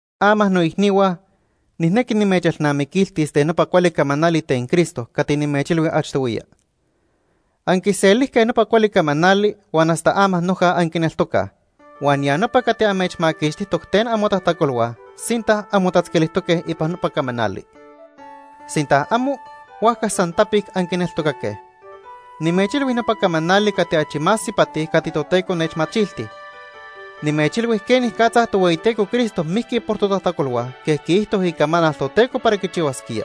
Ama noicnihua, nijnequi nimechelnamiquiltis ten nopa cuali camanali ten Cristo cati nimechilhui achtohuiya. Anquiselijque nopa cuali camanali huan hasta ama noja anquineltocaj, huan ya nopa cati amechmaquixtijtoc ten amotajtacolhua sinta anmotatzquilijtoque ipan nopa camanali. Sinta amo, huajca san tapic anquineltocaque. Nimechilhui nopa camanali cati achi más ipati cati Toteco nechmachilti. Nimechilhui quenicatza Tohueyiteco Cristo mijqui por totajtacolhua quej quiijto Icamanal Toteco para quichihuasquía.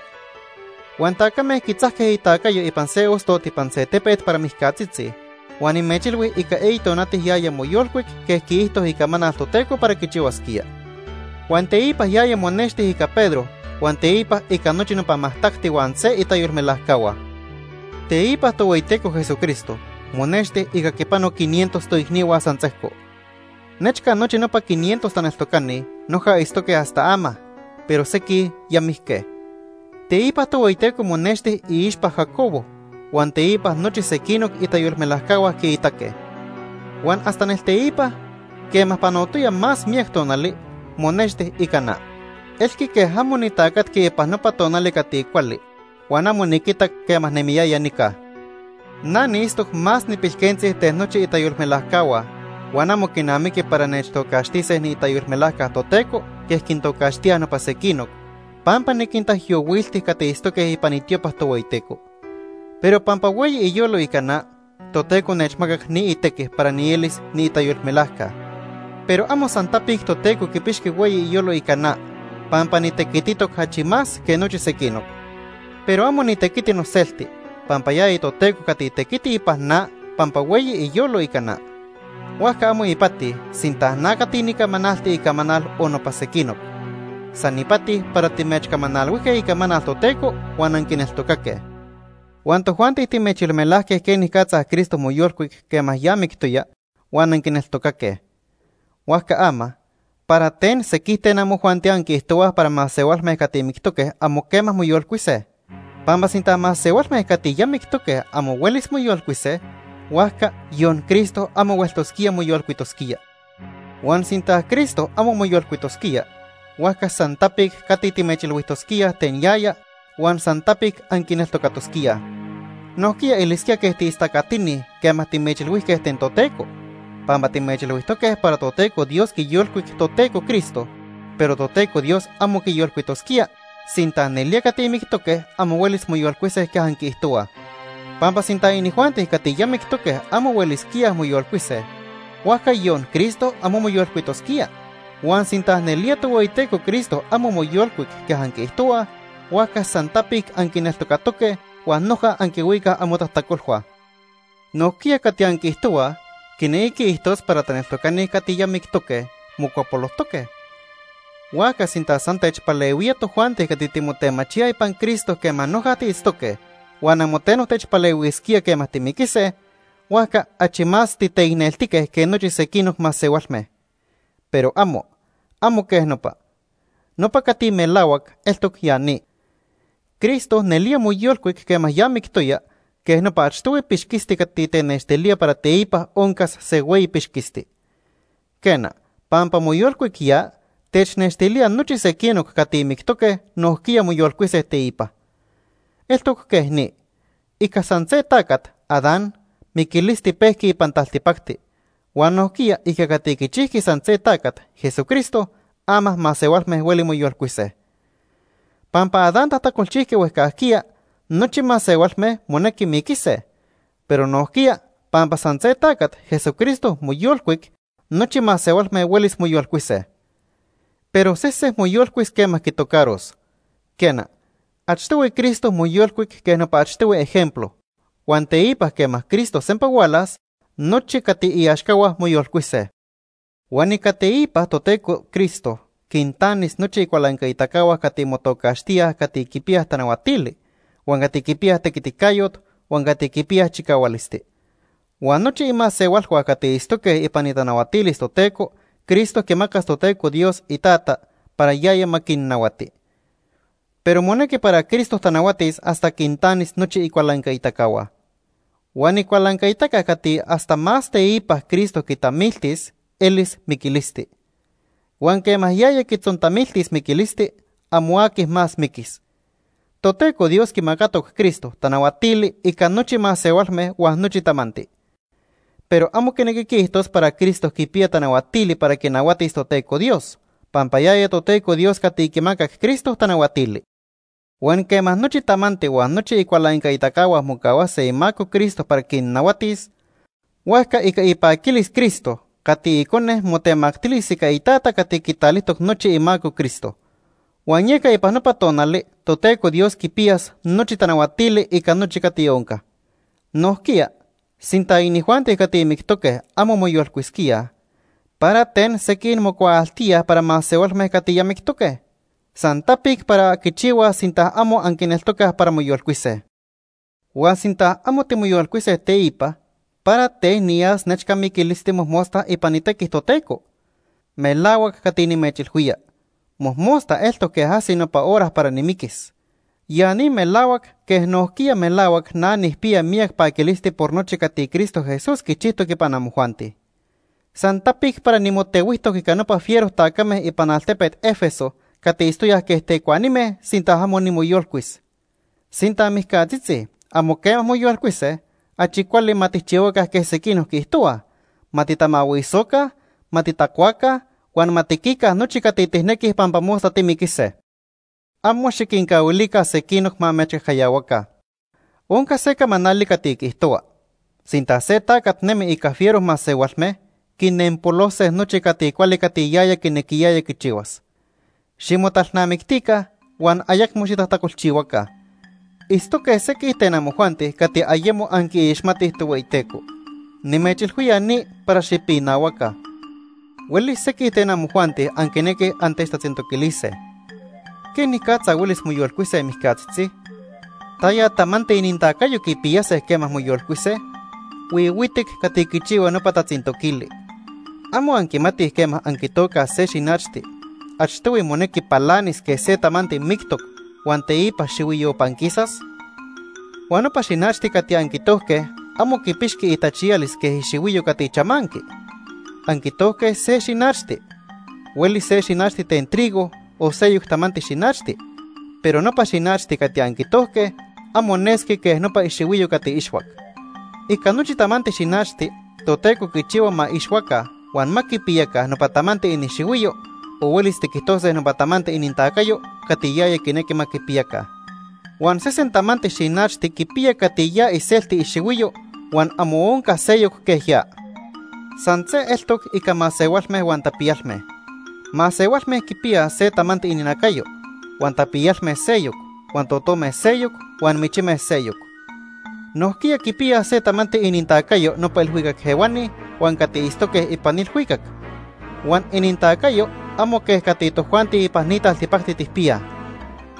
Huan tacame quitzajque itacayo ipan se ostot ipan se tepet para mijcatzitzi, huan nimechilhui ica eyi tonati yaya moyolcuic quej quiijto Icamanal Toteco para quichihuasquía. Huan teipa yaya monexti ica Pedro huan teipa ica nochi nopa majtacti huan se itayolmelajcahua. Teipa Tohueyiteco Jesucristo monexti ica quipano quinientos toicnihua san sejco. Nechca nochi nopa quinientos taneltocani noja itztoque hasta ama, pero sequij ya mijque. Teipa Tohueyiteco monexti iixpa Jacobo, huan teipa nochi sequinoc itayolmelajcahua quiitaque. Huan hasta nelteipa, quema panotoya más miyac tonali, monexti ica na. Elqui quej amo nitacatqui ipan nopa tonali cati cuali huan amo niquitac quema nemiyaya nica. Na niitztoc más nipilquentzi ten nochi itayolmelajcahua huan amo quinamiqui para nechtocaxtise niitayolmelajca Toteco quej quintocaxtíaj nopa sequinoc, pampa niquintaijyohuilti cati itztoque ipan itiopa Tohueyiteco. Pero pampa hueyi iyolo ica na, Toteco nechmacac ni itequi para nielis niitayolmelajca. Pero amo san tapic Toteco quipixqui hueyi iyolo ica na, pampa nitequititoc achi más que nochi sequinoc. Pero amo nitequiti noselti, pampa yaya Toteco cati tequiti ipan na pampa hueyi iyolo ica na. Huajca amo ipati sinta na cati nicamanalti icamanal o nopa sequinoc. San ipati para timechcamanalhuijque icamanal Toteco huan anquineltocaque. Huan tojuanti timechyolmelajque quenicatza Cristo moyolcuic quema ya mictoya huan anquineltocaque. Huajca ama ¿para ten sequij ten amojuanti anquiijtohuaj para masehualme cati mictoque amo quema moyolcuise? Pampa sinta masehualme cati ya mictoque amo huelis moyolcuise, huajca yon Cristo amo hueltosquía moyolcuitosquía. Huan sinta Cristo amo moyolcuitosquía, huajca san tapic cati timechilhuijtosquíaj ten yaya huan san tapic anquineltocatosquíaj. Nojquiya elisquía quej tiistacatini quema timechilhuijque ten Toteco, pampa timechilhuijtoque para Toteco Dios quiyolcuic Toteco Cristo, pero Toteco Dios amo quiyolcuitosquía sinta nelía cati mictoque amo huelis moyolcuise quej anquiijtohuaj. Pampa sinta inijuanti cati ya mictoque amo huelisquíaj moyolcuise, huajca yon Cristo amo moyolcuitosquía. Huan sinta nelía Tohueyiteco Cristo amo moyolcuic quej anquiijtohuaj, huajca san tapic anquineltocatoque huan noja anquihuicaj amotajtacolhua. Nojquiya cati anquiijtohuaj quinequi quiijtos para taneltocani cati ya mictoque, mocuapolojtoque. Huajca sinta san techpalehuía tojuanti cati timotemachíaj ipan Cristo quema noja tiitztoque huan amo teno techpalehuisquía quema timiquise, huajca achi más titeicneltique que nochi sequinoc masehualme. Pero amo, amo quej nopa. Nopa cati melahuac eltoc ya ni. Cristo nelía moyolcuic quema ya mictoya quej nopa achtohui pixquisti cati tenextilía para teipa oncas se hueyi pixquisti. Quena, pampa moyolcuic ya, technextilía nochi sequinoc cati mictoque nojquiya moyolcuise teipa. Eltoc quej ni. Ica san se tacat, Adán, miquilisti pejqui ipan taltipacti, huan nojquiya ica cati quichijqui san se tacat, Jesucristo, ama masehualme hueli moyolcuise. Pampa Adán tajtacolchijqui huejcajquiya, nochi masehualme monequi miquise. Pero nojquiya pampa san se tacat, Jesucristo, moyolcuic, nochi masehualme huelis moyolcuise. Pero sese moyolcuis quema quitocaros. Quena, achtohui Cristo moyolcuic quej nopa achtohui ejemplo, huan teipa quema Cristo sempa hualas, nochi cati iaxcahua moyolcuise. Huan ica teipa Toteco Cristo quintanis nochi icualancaitacahua cati motocaxtíaj cati quipiyaj tanahuatili, huan cati quipiyaj tequiticayot huan cati quipiyaj chicahualisti. Huan nochi imasehualhua cati itztoque ipan itanahuatilis Toteco Cristo quimacas Toteco Dios, iTata, para yaya ma quinnahuati. Pero monequi para Cristo tanahuatis hasta quintanis nochi icualancaitacahua. Huan icualancaitaca cati hasta más teipa Cristo quitamiltis elis miquilisti. Huan quema yaya quitzontamiltis miquilisti, amo aqui más miquis. Toteco Dios quimacatoc Cristo tanahuatili ica nochi masehualme huan nochi tamanti. Pero amo quinequi quiijtos para Cristo quipiya tanahuatili para quinahuatis Toteco Dios, pampa yaya Toteco Dios cati quimacac Cristo tanahuatili. Huan quema nochi tamanti huan nochi icualancaitacahua mocahuase imaco Cristo para quinnahuatis, huajca ica ipaquilis Cristo cati Icone motemactilis ica iTata cati quitalijtoc nochi imaco Cristo. Huan yeca ipan nopa tonali Toteco Dios quipiyas nochi tanahuatili ica nochi cati onca. Nojquiya, sinta inijuanti cati mictoque amo moyolcuisquíaj, ¿para ten sequij mocuaaltíaj para masehualme cati ya mictoque? San tapic para quichihuaj sinta amo anquineltocaj para moyolcuise. Huan sinta amo timoyolcuise teipa, ¿para ten niyas nechca miquilisti mojmosta ipan itequi Toteco? Melahuac cati nimechilhuía, mojmosta eltoc quej ajsi nopa hora para nimiquis. Ya ni melahuac quej nojquiya melahuac na nijpiya miyac paquilisti por nochi cati Cristo Jesús quichijtoc ipan amojuanti. San tapic para nimotehuijtoc ica nopa fiero tacame ipan altepet Éfeso cati itztoyaj quej tecuanime sinta amo nimoyolcuis. Sinta mijcatzitzi amo quema moyolcuise, achi cuali ma tijchihuaca quej sequinoc quiijtohuaj: “Ma titamahuisoca, ma titacuaca huan ma tiquica nochi cati tijnequij pampa mosta timiquise.” Amo xiquincahuilica sequinoc ma amechcajcayahuaca. Onca se camanali cati quiijtohua: “Sinta se tacat nemi ica fiero masehualme, quinempolose nochi cati cuali cati yaya quinequiyaya quichihuas.” Ximotalnamictica huan ayecmo xitajtacolchihuaca. Itztoque sequij ten amojuanti cati ayemo anquiixmatij Tohueyiteco. Nimechilhuía ni para xipinahuaca. Huelis sequij ten amojuanti anquinequij antechtatzintoquilise: “¿Quenicatza huelis moyolcuise mijcatzitzi? ¿Taya tamanti inintacayo quipiyase quema moyolcuise?” Huihuitic cati quichihua nopa tatzintoquili. ¿Amo anquimatij quema anquitocaj se xinachti, achtohui monequi palanis quej se tamanti mictoc huan teipa xihuiyo panquisas? Huan nopa xinachti cati anquitojque amo quipixqui itachiyalis quej ixihuiyo cati chamanqui. Anquitojque se xinachti. Huelis se xinachti ten trigo o seyoc tamanti xinachti, pero nopa xinachti cati anquitojque amo nesqui quej nopa ixihuiyo cati ixhuac. Ica nochi tamanti xinachti Toteco quichihua ma ixhuaca huan ma quipiyaca nopa tamanti inixihuiyo o huelis tiquijtose nopa tamanti inintacayo cati yaya quinequi ma quipiyaca. Huan sesen tamanti xinachti quipiya cati ya iselti ixihuiyo huan amo onca seyoc quej ya. San se eltoc ica masehualme huan tapiyalme. Masehualme quipiyaj se tamanti ininacayo, huan tapiyalme seyoc, huan totome seyoc, huan michime seyoc. Nojquiya quipiyaj se tamanti inintacayo nopa ilhuicac ehuani huan cati itztoque ipan ilhuicac. Huan inintacayo amo quej cati tojuanti ipan ni taltipacti tijpiyaj.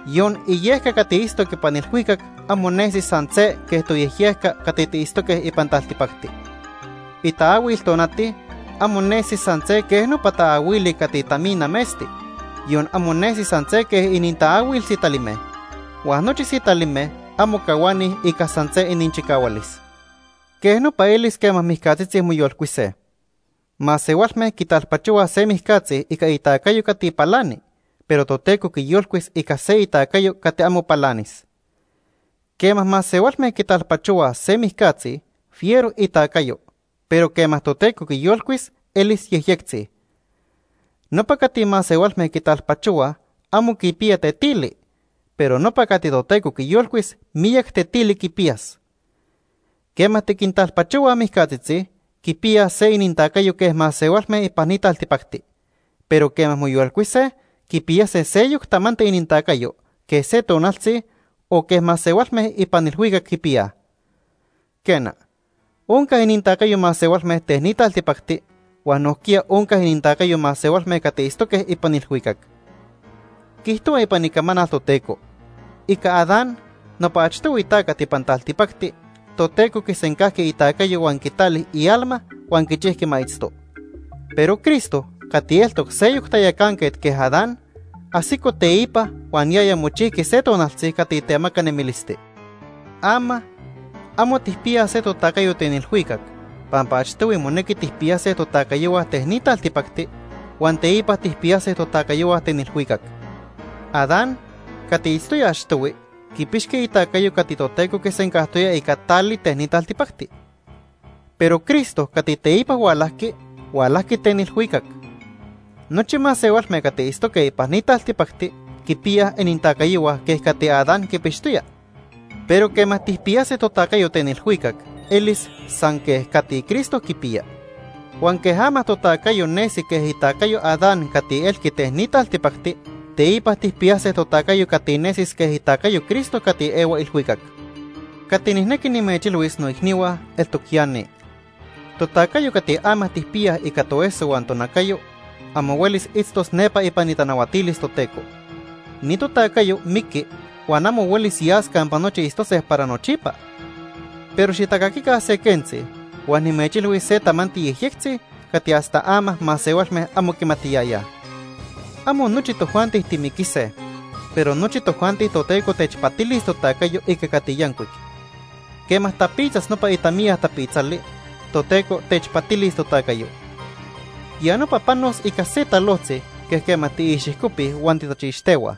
Yon iniyejyejca cati itztoc ipan ilhuicac amo nesi san se quej toyejyejca cati tiitztoque ipan taltipacti. Itaahuil tonati amo nesi san se quej nopa taahuili cati tamina metzti, yon amo nesi san se quej inintaahuil sitalime. Huan nochi sitalime amo cahuanij ica san se ininchicahualis. Quej nopa elis quema mijcatzitzi moyolcuise. Masehualme quitalpachohuaj se mijcatzi ica itacayo cati palani, pero Toteco quiyolcuis ica se itacayo cati amo palanis. Quema masehualme quitalpachohuaj se mijcatzi, fiero itacayo, pero quema Toteco quiyolcuis, elis yejyectzi. Nopa cati masehualme quitalpachohuaj amo quipiya tetili, pero nopa cati Toteco quiyolcuis miyac tetili quipiyas. Quema tiquintalpachohuaj mijcatzitzi, quipiyaj se inintacayo quej masehualme ipan ni taltipacti, pero quema moyolcuise, quipiyase seyoc tamanti inintacayo quej se tonaltzi, o quej masehualme ipan ilhuicac quipiyaj. Quena, onca inintacayo masehualme ten ni taltipacti huan nojquiya onca inintacayo masehualme cati itztoque ipan ilhuicac. Quiijtohua ipan Icamanal Toteco: “Ica Adán, nopa achtohui tacat ipan taltipacti, Toteco quisencajqui itacayo huan quitali ialma huan quichijqui ma itzto.” Pero Cristo, cati eltoc seyoc tayacanquet quej Adán, ajsico teipa huan yaya mochijqui se tonaltzi cati temaca nemilisti. Ama, amo tijpiyaj se totacayo ten ilhuicac, pampa achtohui monequi tijpiyase totacayohua ten ni taltipacti huan teipa tijpiyase totacayohua ten ilhuicac. Adán cati itztoya achtohui, quipixqui itacayo cati Toteco quisencajtoya ica tali ten ni taltipacti. Pero Cristo cati teipa hualajqui, hualajqui ten ilhuicac. Nochi masehualme cati itztoque ipan ni taltipacti quipiyaj inintacayohua quej cati Adán quipixtoya, pero quema tijpiyase totacayo ten ilhuicac, elis san quej cati Cristo quipiya. Huan quej ama totacayo nesi quej itacayo Adán cati elqui ten ni taltipacti, teipa tijpiyase totacayo cati nesis quej itacayo Cristo cati ehua ilhuicac. Cati nijnequi nimechilhuis noicnihua eltoc ya ni. Totacayo cati ama tijpiyaj ica toeso huan tonacayo, amo huelis itztos nepa ipan itanahuatilis Toteco. Ni totacayo miqui huan amo huelis yas campa nochi itztose para nochipa. Pero xitacaquica se quentzi huan nimechilhuis se tamanti yejyectzi cati hasta ama masehualme amo quimatiyayaj. Amo nochi tojuanti timiquise, pero nochi tojuanti Toteco techpatilis totacayo ica cati yancuic. Quema tapitzas nopa itamiya tapitzali, Toteco techpatilis totacayo. Ya nopa panos ica se talojtzi quej quema tiixijcopij huan titachixtehuaj.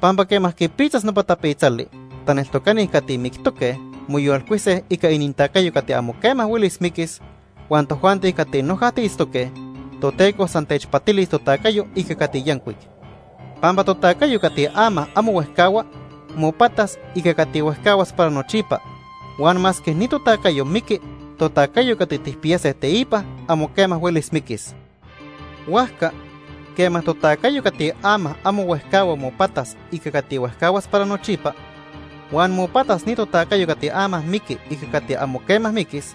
Pampa quema quipitzas nopa tapitzali, taneltocani cati mictoque, moyolcuise ica inintacayo cati amo quema huelis miquis, huan tojuanti cati noja tiitztoque, Toteco san techpatilis totacayo ica cati yancuic. Pampa totacayo cati ama amo huejcahua, mopatas ica cati huejcahuas para nochipa, huan masque ni totacayo miqui, totacayo cati tijpiyase teipa, amo quema huelis miquis. Huajca, quema totacayo cati ama amo huejcahua mopatas ica cati huejcahuas para nochipa, huan mopatas ni totacayo cati ama miqui ica cati amo quema miquis,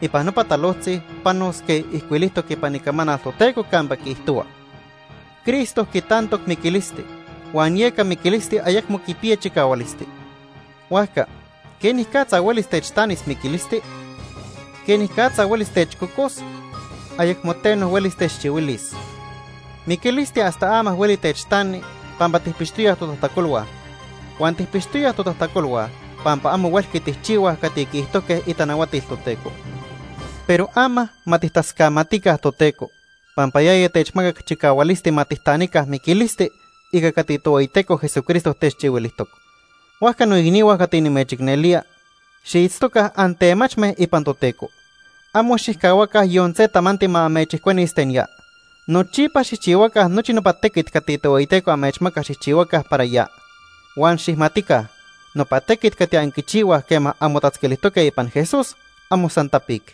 ipan nopa talojtzi panos quej ijcuilijtoc ipan Icamanal Toteco campa quiijtohua: “Cristo quitantoc miquilisti huan yeca miquilisti ayecmo quipiya chicahualisti. Huajca ¿quenicatza huelis techtanis miquilisti? ¿Quenicatza huelis techcocos? Ayecmo teno huelis techchihuilis.” Miquilisti hasta ama hueli techtani pampa tijpixtoyaj totajtacolhua, huan tijpixtoyaj totajtacolhua pampa amo huelqui tijchihuaj cati quiijtojque itanahuatil Toteco. Pero ama ma tijtascamatica Toteco pampa yaya techmacac chicahualisti ma tijtanica miquilisti ica cati Tohueyiteco Jesucristo techchihuilijtoc. Huajca noicnihua cati nimechicnelía, xiitztoca antemachme ipan Toteco. Amo xijcahuaca yon se tamanti ma amechijcuenis ten ya. Nochipa xijchihuaca nochi nopa tequit cati Tohueyiteco amechmaca xijchihuaca para ya. Huan xijmatica nopa tequit cati anquichihuaj quema anmotatzquilijtoque ipan Jesús, amo san tapic.